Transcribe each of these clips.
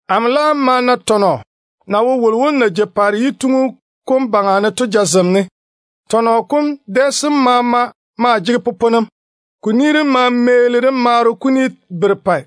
Amo laam ma na tɔnɔ na wo wolo wom na jei paare yituŋu kom baŋa ne to jazem ne. Tɔnɔ kom dɛ sem maama maa jege poponem. Ko ni dem ma meeni de maaro kuni berepɛ.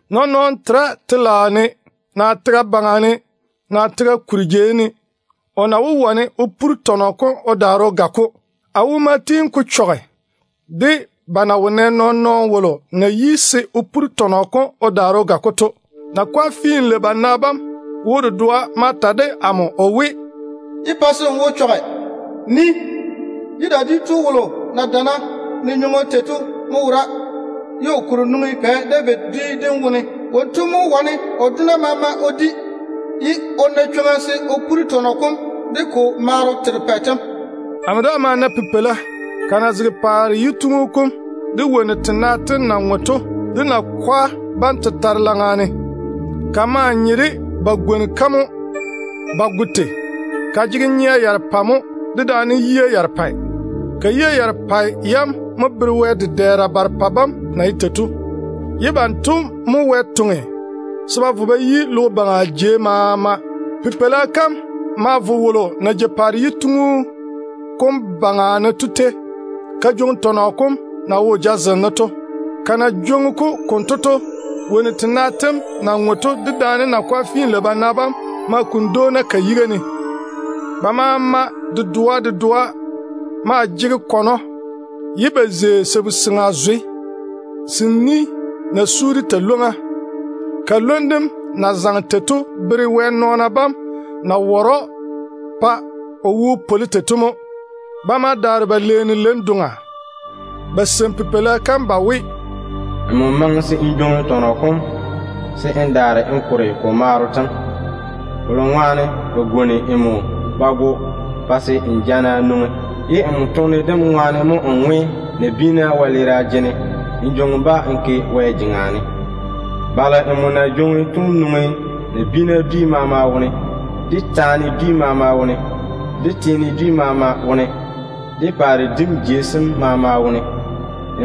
Nɔɔn-nɔɔno tera telaao ne, naa tega baŋa ne, naa tega kuri jei ne, o na wó wane o puri tɔnɔ kom o daare o ga-ko. A wo ma tiini ko chɔge de ba na wo nɛ nɔɔn-nɔɔno wolo na yi se o puri tɔnɔ kom o daare o ga-ko to. Nakwa finlei-bana bam wo dedoa ma ta de amo o we, “Yé pa se n wo chɔge. Nii. Judah dwi tu wolo na dana ne nywoŋo tei to mo wora, ye o kuri nwoŋi Pɛ David dwi dem wone. Wonto mo wane o dona maama o di, ye o na chwoŋa se o puri tɔnɔ kom de ko maaro terepɛ tem.” Amo daa ma na Pipeila, ka na zege paare yituŋu kom, de wonnu tena tem na ŋwe to, de nakwa bam tetare laŋa ne. Ka maa nye de ba ya gwoni-ka mo ba go. Ka jege nyea yarepɛ mo dedaane yia yarepɛ. Ka yia yarepɛ yam mo bere Wɛ dedɛɛra barepɛ bam na ye tei to, ye banto mo Wɛ toŋe logo baŋa ni maama ne. Pipeila kam laam ma vo wolo na jei paare yituŋu kom baŋa ne to tei ka jwoŋi tɔnɔ kom na wo o jazem ne to. Ka na jwoŋi-ko konto to, wonnu tena tem na ŋwe to dedaane nakwa finlei-bana bam ma kuni dwoona ka yiga ne. Ba maama dedoa dedoa maa jege kɔnɔ, ye ba zei sabu-seŋa zwe se ni na su de talwoŋ-ywoŋa. Ka lwom dem na zaŋe tei to bere Wɛ tete nɔɔna bam na ware‑o tei to mo. Ba ma daare ba leeni leiŋ-doŋa ba seini Pipeila kam ba we: “Nmo yi se n jwoŋi tɔnɔ kom se n daare n kore ko maaro tem. Kolo ŋwaane ba ya gwoni nmo ba go, ye n tɔge n toone jana bam ŋwaane mo n ŋwe nabiina wɛleera jene n daare n jwoŋi-ba n ke Wɛ jeŋa ne. Balo nmo na jwoŋi to nwoŋi nabiina dwi maama wone, de taana dwi maama tiina wone, de teene maama wone, de paare dim jei sem maama wone mo.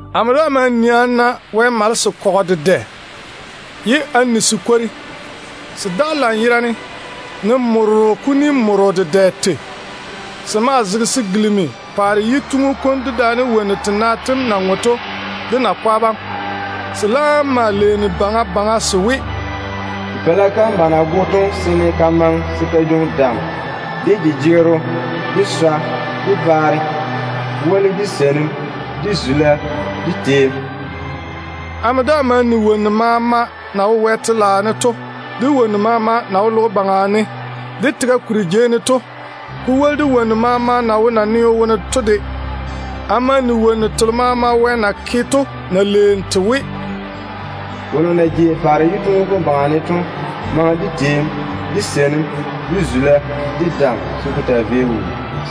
Amo daa ma nii a na Wɛ malese kɔgɔ dedɛ, ye a ni se kwori. Se daga lanyerane ne morro kuni morro dedɛ mo tei. Se maa zege se gilimi paare yituŋu kom, dedaane wonnu tena tem na ŋwe to, de nakwa bam. Se laam ma leeni baŋa baŋa se we: “Pipeila kam ba na go to seene ka maŋe se ka jwoŋi dam, de nadunni, de swa, de baare, ko woli de seinim, de zula, de teem.” Amo daa ma ni wonnu maama na wo Wɛ telaao ne to, de telo maama na wo logo baŋa ne de tega kuri jei ne to, ko woli de wonnu maama na wo naneo wone to de. Ko maa ye wonnu telo maama Wɛ na ke to mo leeni te we: “Wolo na jei paare yituŋu kom baŋa ne to, dedaane Pipeila kam maŋe de teem, de seinim, de zula, de dam, se ko taa vei wuu.”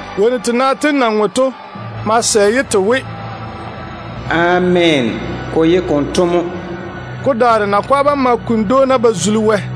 Wonnu tena tem na ŋwe to ma sɛ ye te we, “Ameena. Ko ye konto mo.” Ko daare nakwa bam ma kuni dwoona ba zuli Wɛ.